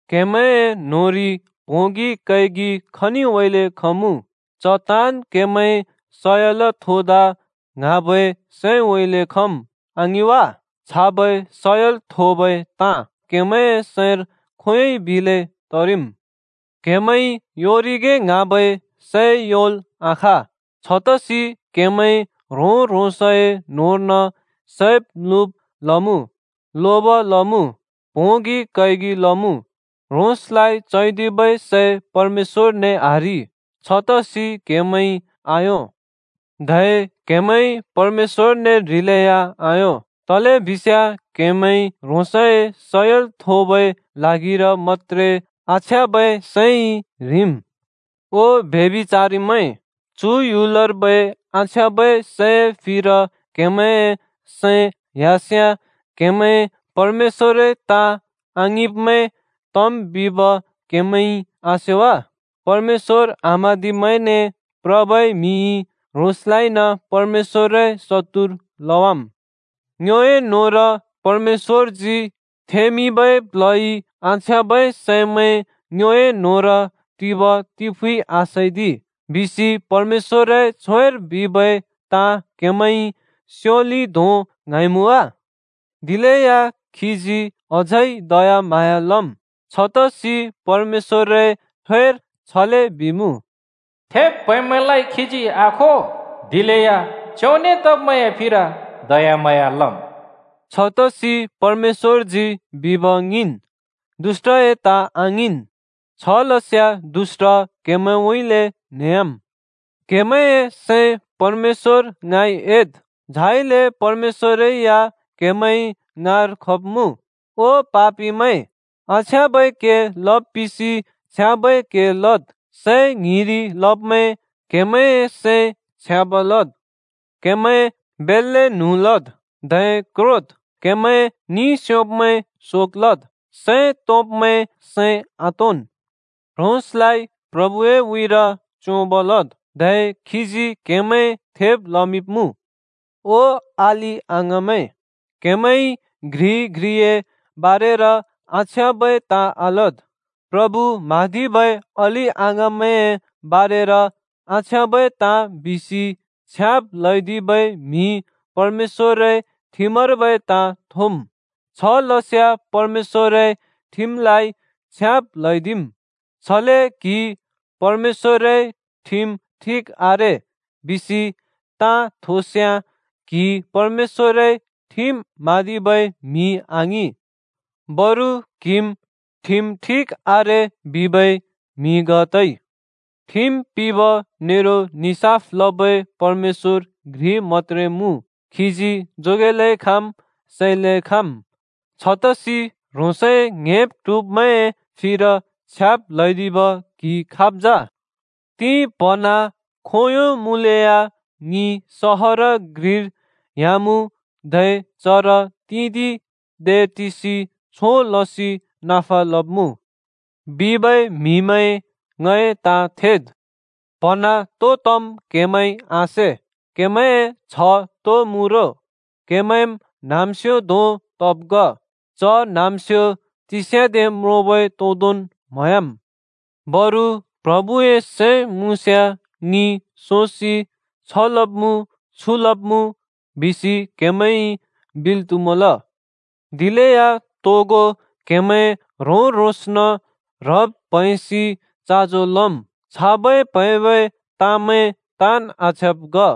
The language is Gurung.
क्‍हेमैंए न्‍होंरि प्होंगि कैगि खनिउँइँले खमुँ? च ताँन् केमैं सयल थोदा ङ्हाँबै सैंउँइँले खम्, आङिं वा? छाबै सयल थोबै ताँ क्‍हेमैंए सैंर खोंयोंइ बिले तरिम्। क्‍हेमैंइ योंरिगे ङ्हाँबै सै योंल् आखाँ। छतसि क्‍हेमैं ह्रों-ह्रोंसए न्होंर्न सैब् म्‍लुब लमुँ, लोब लमुँ, प्होंगि कैगि लमुँ। ह्रोंसलाइ चैदिबै सै परमेश्‍वरने आह्रि, छतसि क्हेमैंइ आयों। धै क्‍हेमैंइ परमेश्‍वरने ह्रिलेया आयों, तलेबिस्याँ क्‍हेमैंइ ह्रोंसए सयल थोबै ल्हागिर मत्‍त्रे आछ्याँबै सैंइ ह्रिम्। ओ ब्यभिचारिमैं, चु ह्‍युलर्बै आछ्याँबै सैए फिर क्हेमैंए सैं ह्‍यास्याँ क्‍हेमैं परमेश्‍वरए ताँ आङिंब्मैं तम् बिब क्हेमैंइ आसे वा? परमेश्‍वर आम्हाँदिब्‍मैंने प्रबै म्हिइ ह्रोंसलाइन परमेश्‍वरए शत्तुर लवाम्। “ङ्योए न्होंर परमेश्‍वरजी थेंमिंबै प्ल्हइ आछ्याँबै सैमैं ङ्योए न्होंर टिब तिफुँइ आसैदि,” बिसि परमेश्‍वरए छ्वेर बिबै ताँ क्हेमैंइ स्योलि धों ङ्हाँइमुँ वा? दिलेया खीजी अझै दयाम्हाँया लम्। छतसि परमेश्‍वरए छ्वेर छले बिइमुँ, “थेब् प्हैंब्मैंलाइ खीजी आखो, दिलेया च्योंने तब्मैंए फिर दयाम्हाँया लम्।” छतसि परमेश्‍वरजी बिब ङिंन्, दुष्‍टए ताँ आङिंन्। छलस्याँ दुष्‍ट क्‍हेमैंउँइँले न्हेह्‍याम्। क्हेमैंए सैं परमेश्‍वर ङाँइ एद्, झाइले परमेश्‍वरै या क्‍हेमैं ङाँर खब्‍मुँ। ओ पापिमैं! आछ्याँबै के लब् पिसि छ्याँबै के लद्। सैं ङ्हिंरि लब्मैं! क्हेमैंए सैं छ्याँब लद्। क्हेमैं बेल्‍ले न्हुँ लद्, धै क्रोद्। क्हेमैं निस्योब्मैं शोक लद्, सैं तोंब्मैं सैं आतोंन्। ह्रोंसलाइ प्रभुए उँइँर च्‍योंब लद्, धै खीजी क्‍हेमैं थेब लमिंब्‍मुँ। ओ अलि-अङाँमैं, क्हेमैंइ घ्रिइ घ्रिए बारेर आछ्याँबै ताँ आलद्। प्रभु म्हाँदिबै अलि-अङाँमैंए बारेर आछ्याँबै ताँ बिसि छ्याब् ल्हैदिबै म्हि परमेश्‍वरए ठिमर्बै ताँ थोम्। छलस्याँ परमेश्‍वरए ठिमलाइ छ्याब् ल्हैदिम्। छले क्हिइ “परमेश्‍वरए ठिम ठिक आरे” बिसि ताँ थोस्याँ, क्हि परमेश्‍वरए ठिम म्हाँदिबै म्हि आङिं, बरु क्हिम् “ठिम ठिक आरे” बिबै म्हि ग तइ। ठिम पिंब नेरो निसाफ लबै परमेश्‍वर घ्रि मत्‍त्रे मुँ, खीजी जोगेलै खाँम्, सैलै खाँम्। छतसि ह्रोंसए ङ्‍हेब् ट्हुब्मैंए फिर छ्याब् ल्‍हैदिब क्हि खाब् जा? “तिं-प्‍हन्हाँ खोंयों मुँले या ङि सहर घ्रिर ह्‍यामुँ धै चर तिंदिं दे टिसि छों लसि नफा लब्मुँ,” बिबै म्हिमैं, ङए ताँ थेद्! प्हँना तो तम् क्हेमैंइ आसे। क्हेमैंए छ्ह तो मुँ रो? क्हेमैंम् न्हाँम्स्‍यो धों तब् ग। च न्हाँम्स्‍यो तिस्याँदे म्रोंबै तोंदोंन् म्‍हयाम्। बरु “प्रभुए सैं मुँस्याँ ङि सोसि छ लब्मुँ छु लब्मुँ,” बिसि क्हेमैंइ बिल् त्हुमल। दिलेया तोगो क्‍हेमैं ह्रों-ह्रोंसन् ह्रब् प्हैंसि चाँजो लम्। छाबै प्हैंबै ताँमैं ताँन् आछ्याँब् ग।